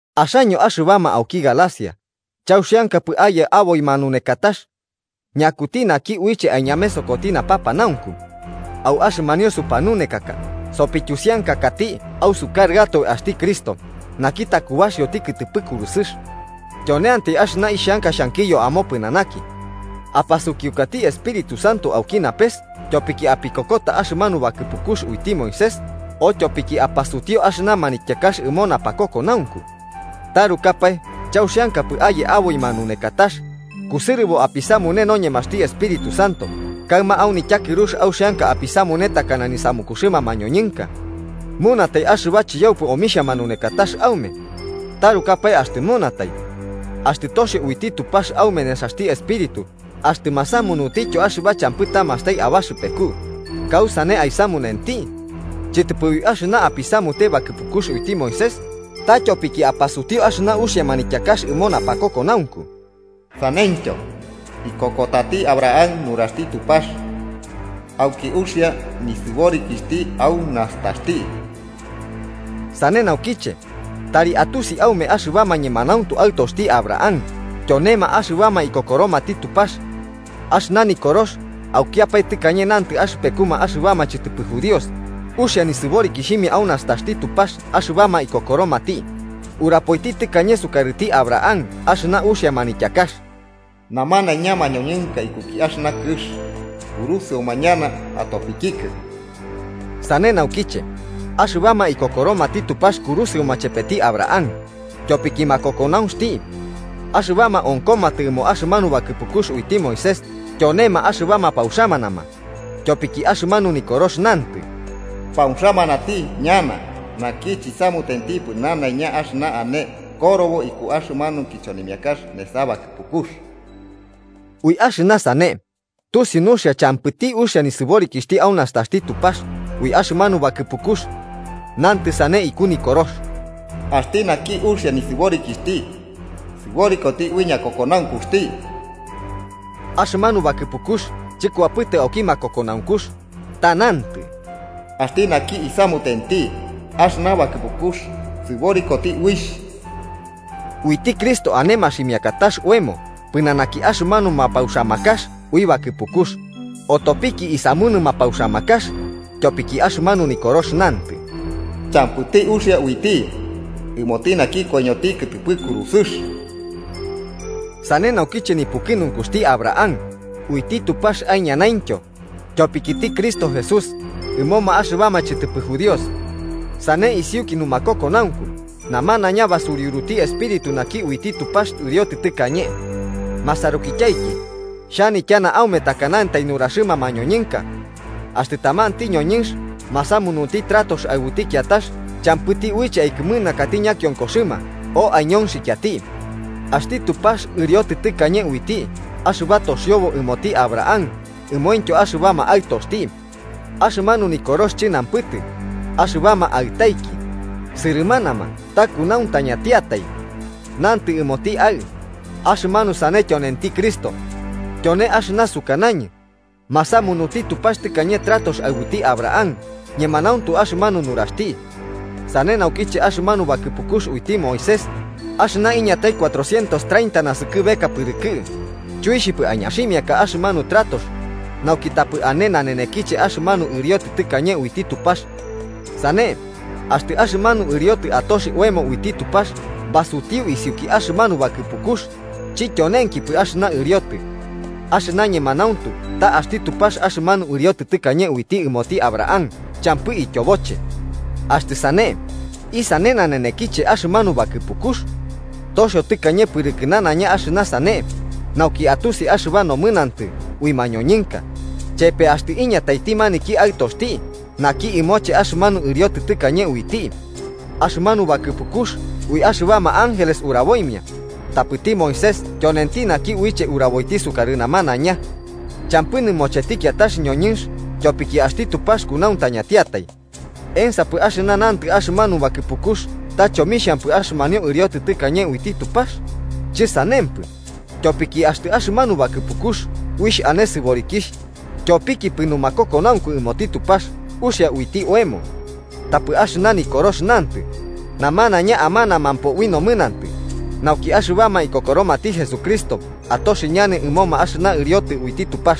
¡Axaño axɨbama auki Galacia, chauxiankapɨ aye aboi manunekatax! ¿Ñakuti naki uiche aiñamesokoti napapanaunku? Au axɨmanio supanunekaka sopityusiankakati ausukarɨatoe axti Cristo naki takubaxioti kɨtɨpɨ kurusɨx. Tyoneantai axɨna ixhanka xhankiyo amopɨnanaki: ¿Apasukiukati Espíritu Santo auki napes tyopiki apikokota axɨmanu bakɨpukux uiti Moisés o tyopiki apasutiu axɨna manityakax ɨmo napakokonaunku? ¿Tarukapae chauxiankapɨ aye aboi manunekatax, kusɨrɨbo apisamune noñemaxti Espíritu Santo kaɨma au nityakɨrux auxianka apisamune takana nisamukuxɨma mañoñɨnka? ¿Munatai axɨba chiyaupɨ omixhia manunekatax aume? ¡Tarukapae axtɨ munatai! Axtɨ toxio uiti Tupax aume nesaxti Espíritu axtɨ masamunutityo axɨba champɨ tamastai abaxɨpeku, ¿kausane aisamunenti? Chɨtɨpɨ ui axɨna apisamute bakɨpukux uiti Moisés, ta tyopiki apasutiu axɨna uxia manityakax ɨmo napakokonaunku. Saneityo, ikokotati Abraham nuraxti Tupax auki uxia nisɨborikixhti au nastaxti. Sane naukiche, tari atusi aume axɨbama ñemanauntu aɨtoxti Abraham tyonema axɨbama ikokoromati Tupax. Axɨna Nikorox, aukiapae tɨkañe nantɨ axɨpekuma axɨbama chɨtɨpɨ judíos uxia nisɨborikixhimia au nastaxti Tupax axɨbama ikokoromati, urapoiti tɨkañe sukarɨti Abraham axɨna uxia manityakax: “Namanaiña mañoñɨnka ikuki axɨna kɨx kurusɨoma ñana atopikikɨ.” Sane naukiche, axɨbama ikokoromati Tupax kurusɨoma chepeti Abraham, tyopiki makokonauxti. Axɨbama onkomatɨ ɨmo axɨmanu bakɨpukux uiti Moisés tyonema axɨbama pauxamanama, tyopiki axɨmanu Nikorox nantɨ: “Pauxamanati ñana naki chisamutentipɨ nanaiña axɨna ane korobo iku axɨmanu kichonimiakax nesa bakɨpukux.” Ui axɨna sane, tusiu nuxia champɨti uxia nisɨborikixhti au nastaxti Tupax ui axɨmanu bakɨpukux. Nantɨ sane iku Nikorox: “Axti naki uxia nisɨborikixhti sɨborikoti ui ñakokonaunkuxti.” Axɨmanu bakɨpukux chɨkuapɨtɨ auki makokonankux, ta nantɨ: “Axti naki isamutenti axɨna bakɨpukux sɨborikoti uixh.” Uiti Cristo ane maximiakatax oemo pɨnanaki axɨmanu mapauxamakax ui bakɨpukux, otopiki isamunɨ mapauxamakax, tyopiki axɨmanu Nikorox nantɨ: “Champɨti uxia uiti ɨmoti naki koiñoti kɨtɨpɨ kurusɨx.” Sane nauki nipukɨnunkuxti Abraham uiti Tupax aiñanaintyo tyopikiti Cristo Jesús ɨmoma axɨbama chɨtɨpɨ judíos. Sane isiuki numakokonaunku namanaiña basuriuruti Espíritu naki uiti Tupax ɨriotɨ tɨkañe. Masarukityaiki, xhanityana aume takanantai nuraxɨma mañoñɨnka: Axtɨ tamanti ñoñɨnx masamunti tratox aɨbuti kiatax champɨti uiche aikɨmɨnakati ñakionkoxɨma o aiñonxikiati. Axti Tupax ɨriotɨ tɨkañe uiti axɨba toxiobo ɨmoti Abraham ɨmomaintyo axɨbama aɨtoxti. Axɨmanu Nikorox chɨnanpɨtɨ “axɨbama aɨtaiki”, sɨrɨmanama, ta kunauntañatiatai. Nantɨ: “ɨmoti aɨ”, axɨmanu sane tyonenti Cristo. Tyone axɨna sukanañɨ: masamunuti Tupax tɨkañe tratox aɨbuti Abraham, ñemanauntu axɨmanu nuraxti. Sane naukiche, axɨmanu bakɨpukux uiti Moisés, axɨna iñatai cuatrocientos treinta naskɨbeka pɨrɨkɨ, chuixhipɨ aiñaximiaka axɨmanu tratox, nauki tapɨ ane nanenekiche axɨmanu ɨriotɨ tɨkañe uiti Tupax. Sane, axtɨ axɨmanu ɨriotɨ atoxi oemo uiti Tupax basutiu isiuki axɨmanu bakɨpukux, chityonenkipɨ axɨna ɨriotɨ. Axɨna ñemanauntu ta axti Tupax axɨmanu ɨriotɨ tɨkañe uiti ɨmoti Abraham champɨ ityoboche. Axtɨ sane, ¿isane nanenekiche axɨmanu bakɨpukux? Toxio tɨkañe pɨrɨkɨ nanaiña axɨna sane, nauki atusi axɨba nomɨnantɨ ui mañoñɨnka, chepe axtɨ iñataiti maniki “Aɨtoxti” naki ɨmoche axɨmanu ɨriotɨ tɨkañe uiti. Axɨmanu bakɨpukux ui axɨbama ángeles uraboimia, tapɨti Moisés tyonenti naki uiche uraboiti sukarɨ namanaiña. Champɨ nɨmocheti kiatax ñoñɨnx tyopiki axti Tupax kunauntañantiatai. ¿Ensapɨ axɨna nantɨ axɨmanu bakɨpukux ta chomixhampɨ axɨmanio ɨriotɨ tɨkañe uiti Tupax? ¡Chɨsanempɨ! Tyopiki axtɨ axɨmanu bakɨpukux uixh ane sɨborikixh, tyopikipɨ numakokonaunku ɨmoti Tupax uxia uiti oemo. Tapɨ axɨna Nikorox nantɨ, namanaiña amanamampo ui nomɨnantɨ, nauki axɨbama ikokoromati Jesucristo atoxi ñana ɨmoma axɨna ɨriotɨ uiti Tupax.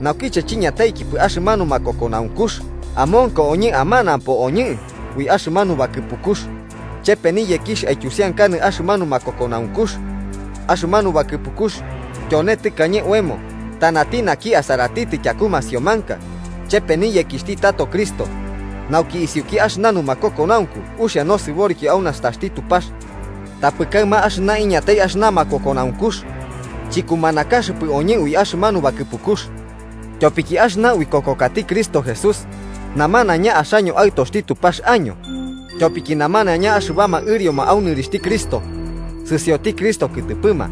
Naukiche chiñataikipɨ axɨmanu makokonaunkux amonko oñɨ amanapo oñɨ ui axɨmanu bakɨpukux, chepe niyekixh aityusiankanɨ axɨmanu makokonaunkux. Axɨmanu bakɨpukux tyone tɨkañe oemo tanati naki asaratitɨ tyaku masiomanka, chepe niyekixhti tato Cristo, nauki isiuki axɨna numakokonaunku uxia nosɨboriki au nastaxti Tupax. Tapɨ kaɨma axɨna iñatai axɨna makokonaunkux, chikumanakaxɨpɨ oñɨ ui axɨmanu bakɨpukux, tyopiki axɨna uikokokati Cristo Jesús namanaiña axaño aɨtoxti Tupax año, tyopiki namanaiña axɨbama ɨrioma au nɨrixhti Cristo, sɨsioti Cristo kɨtɨpɨma.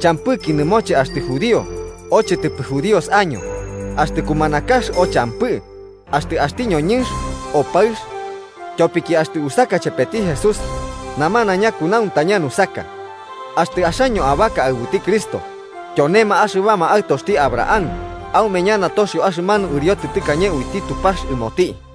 Champɨki nɨmoche axtɨ judío o chɨtɨpɨ judíos año, axtɨ kumanakax o champɨ, axtɨ axti ñoñɨnx o paɨx. Tyopiki axtɨ usaka chepeti Jesús, namanaiña kunauntaña nusaka. Axtɨ axaño abaka aɨbuti Cristo, tyonema axɨbama aɨtoxti Abraham aume ñana toxio axɨmanu ɨriotɨ tɨkañe uiti Tupax ɨmoti.